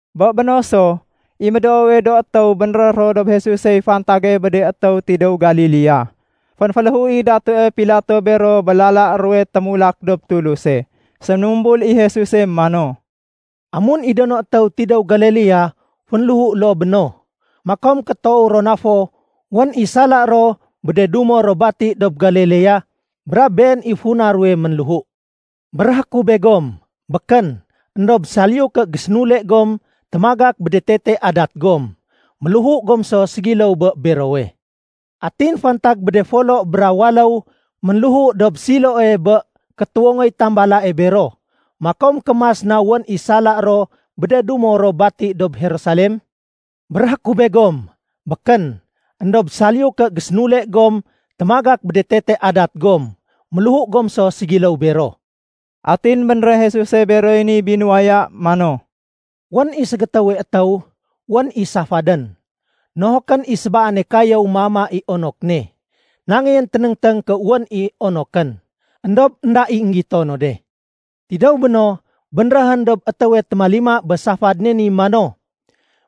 Bé béno so, i médoowe do étéw bénréh ro dob Jesusey fantage bé de étéw tidéw Galilea. Fénféléhu i Datue Pilato bero bé lala ruwe témulak dob Tuluse. Séménumbul i Jesuse mano, “Amun i do no étéw tidéw Galilea fénléhu loo bé no, makom ké toow ro na fo wén i sala ro bé de dumo ro bati dob Galilea, brab been i funa ruwe ménléhu. Béréhé ku begom, békén. Endob saliyu ké gésénule gom témagak bé tetee adat gom, méléhu gom so ségiléw bé berowe. Atin fantag bé de folo bra waléw ménléhu dob Siloe bé kétuwongoy tambalae bero, makom ké mas na wén i sala ro bé de dumo ro bati dob Jerusalem? Béréhé ku begom, békén. Endob saliyu ké gésénule gom témagak bé tetee adat gom, méléhu gom so ségiléw bero.” Atin bénréh Jesuse beroy ni binuwaya mano, “Wén i ségétéwe étéw, wén i safadén. Nohokén i sébaane kayéw méama i onok ne. Nangéyén ténéngténg ké wén i onokén, éndob énda i énggito no de. Tidéw béno, bénréhén dob étéwe témalima bé safad ne ni mano,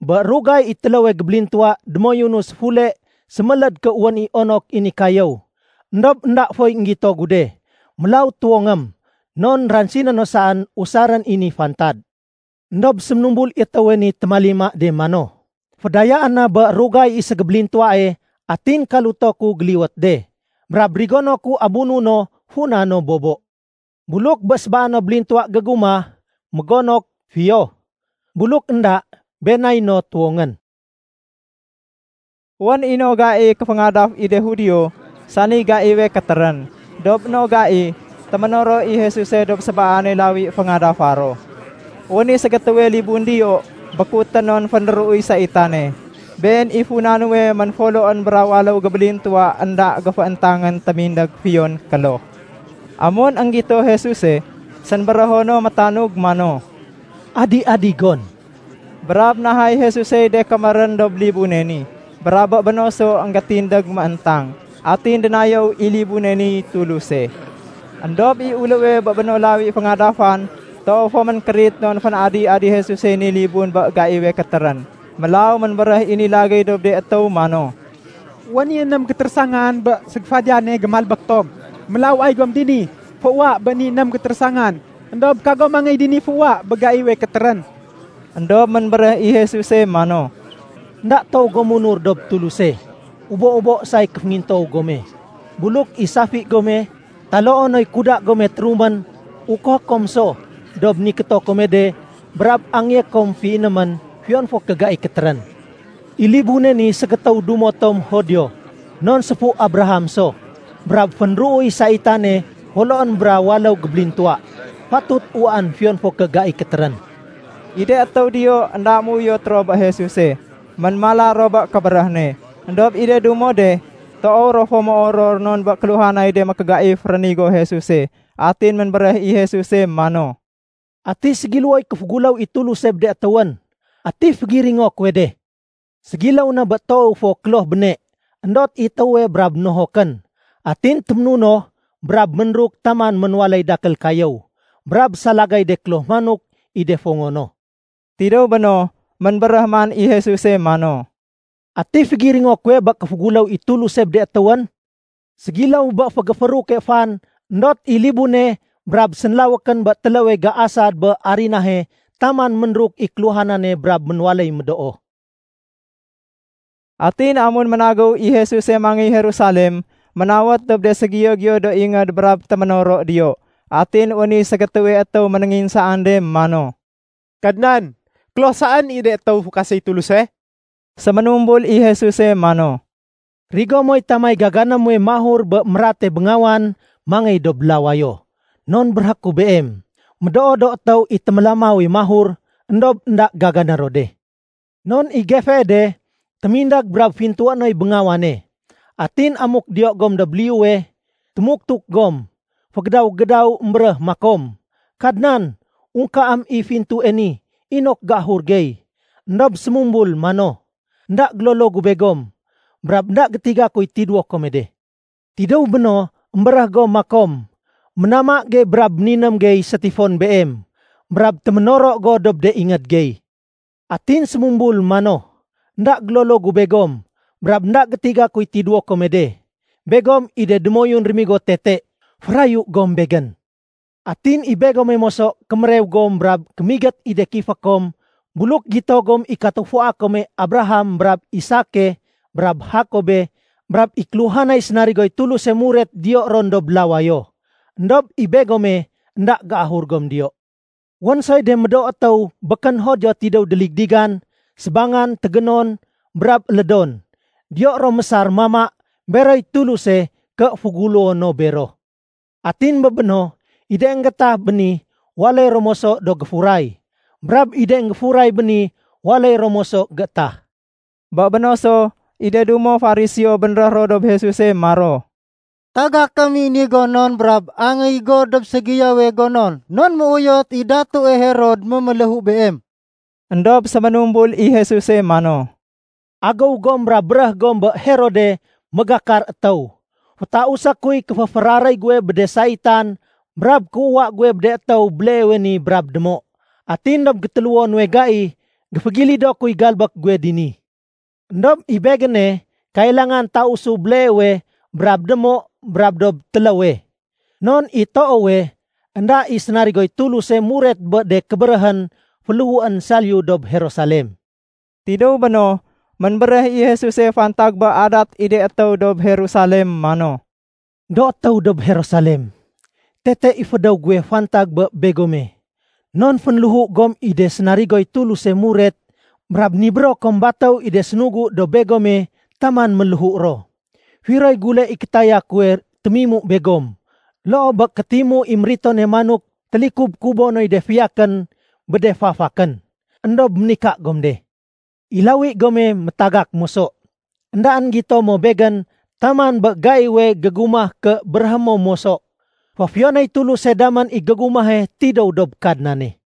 ‘Bé rugay i téléwe gébélintuwa démoyunu séfule séméléd ké wén i onok i ni kayéw, éndob énda foy énggito gu de. Mélaw tuwongém, non ransiné no saén usarén i ni fantad.’ Endob séménumbul i étéwe ni témalima de mano, ‘Fédayaén na bé rugay i ségébélintuwae atin kaluto ku géliwét de. Brab rigono ku abuno funa no bobo. Buluk bé sébaano bélintuwa gégumah mégonok, fiyo. Buluk énda, been nay no tuwongén.’” Wén i no gai kéféngadaf i de Judio, sani gaiwe kétérén. Dob no gai, téménoro i Jesuse dob sébaane lawi féngadafa ro. Wén i ségétéwe libun diyo békutén non féndéruuy saitane. Been i funa nuwe ménfoloén bra waléw gébélintuwa énda géfééntangén témindég fiyon kloh. Amun énggito Jesuse, sénbérého no métanug mano, “Adi-adi gon!” Brab nahay Jesusey de kémérén dob libune ni, brab bé béno so énggétindég mééntang. Atin dénayéw i libune niy Tuluse. Endob i uléwe bé no lawi féngadafan toow fo ménkérit non fén-adi-adi Jesusey ni libun bé gaiwe kétérén. Mélaw ménbéréh i ni lagéy dob de étéw mano, “Wén i ném gétérésangan bé ségéfadiyane gémalbék tom, mélaw ay gom dini féuwa bé ni ném gétérésangan. Endob kagom mangéy dini féuwa bé gaiwe kétérén.” Endob ménbéréh i Jesuse mano, “Enda toow gom munur dob Tuluse, ubo-ubo say kéféngintoow gome. Buluk i safi gome taloo noy kuda gome térumén, ukohé kom so dob nikéto kome de brab angéyé kom féinémén fiyon fo ké gai kétérén. I libune ni ségétéw dumo tom Judio non séfu Abraham so, brab féndéruuy saitane foloén bra waléw gébélintuwa. Fatut uwaén fiyon fo ké gai kétérén.” I de étéw diyo énda ménuyot ro bé Jesuse, ménmala ro bé kébéréh ne. Endob i de dumo de, toow ro fo méoror non bé kéluhanay de mékégaif rénigo Jesuse. Atin ménbéréh i Jesuse mano, “Ati ségiléwoy kéféguléw i Tuluse bé de étéwén? Ati fégiringo kuwe de? Ségiléw na bé toowe fo kloh béne, éndot i étéwe brab nohokén. Atin téménunoh brab méruk taman ménwaléy dakél kayéw. Brab salagay de kloh manok i de fongo no.” Tidéw béno, ménbéréh man i Jesuse mano, “Ati fégiringo kuwe bé kéféguléw i Tuluse bé de étéwén? Ségiléw bé fégéfééruke fan éndot i libune brab sénlawékén bé téléwe géasad bé arinahe taman ménruk i kéluhanane brab ménwaléy médoo.” Atin amun ménagéw i Jesuse mangéy Jerusalem, ménawét dob de ségiyo-giyo do ingéd brab téménoro diyo. Atin wén i ségétéwe étéw ménénginsaan de mano, “Kadnan, kloh saén i de étéw fukaséy Tuluse?” Séménumbul i Jesuse manó, “Rigo moy tamay gagané muwe mahur bé mérate béngawan mangéy dob lawayo, non béréhé ku beem, médoo do étéw i témélamawe mahur, éndob énda gagané ro de. Non i gefee de témindég brab fintué noy béngawane. Atin amuk diyo gom dob liyuwe, témuktuk gom, fégédaw-gédaw émbéréh makom, ‘Kadnan, ungkaém i fintue ni inok géahur gey.’ Endob sémumbul mano, ‘Enda gélolo gu begom. Brab énda gétiga kuy tidéwo kome de.’ Tidéw béno, émbéréh gom makom, ‘Ménama gey brab méniném gey sétifon Beem. Brab téménoro go dob de ingéd gey.’ Atin sémumbul mano, ‘Enda gélolo gu begom. Brab énda gétiga kuy tidéwo kome de. Begom i de démoyun rémigo tete. Férayu gom Begén.’ Atin i begome moso kémérew gom brab kémigét i de kifé kom buluk gito gom i katufua kome Abraham brab Isake, brab Jakobe, brab i kéluhanay sénarigoy Tuluse muret diyo ron dob lawayo. Endob i begome énda géahur gom diyo. Wén soy de médoo étéw békén Judio tidéw déligdigan, sébangan, tégénon, brab élédon, diyo ro géésar mama beroy Tuluse ké féguléwo no bero. Atin bé béno, i de énggétah béni waléy ro moso do géfuray. Brab i de énggéfuray béni waléy ro moso géétah.” Bé béno so, i de dumo Fariseo bénréh ro dob Jesuse maro, “Tagakém i ni gonon brab angéy go dob ségiyowe gonon non méuyot i Datue Herod méméléhu Beem.” Endob séménumbul i Jesuse mano, “Agéw gom brab béréh gom bé Herode mégakar étéw, fétausé kuy kéféféraréy guwe bé de saitan brab kéuwa guwe bé de étéw béleewe ni brab démo. Atin dob gétéléwo nuwe gai, géfégilido kuy galbék guwe dini. Endob i Begéne kailangan tausu béleewe brab démo brab dob téléwe. Non i toowe, énda i sénarigoy Tuluse muret bé de kébéréhén féléhuén saliyu dob Jerusalem.” Tidéw béno, ménbéréh i Jesuse fantag bé adat i de étéw dob Jerusalem mano, “Do étéw dob Jerusalem, tete i fédéw guwe fantag bé begome non fénléhu gom i de sénarigoy Tuluse muret brab nibéro kom batéw i de sénugu dob begome taman ménléhu ro. Firoy gule i kétaya kuwe témimu begom loo bé kétimu i méritone manok télikub-kubo noy de fiyakén bé de fafakén? Endob ménika gom de. I lawi gome métagak moso. Endaén gito mo Begén taman bé gaiwe gégumah ké béréhé mo moso, ‘Féfiyonéy Tuluse damén i gégumahe tidéw dob Kadnane.’”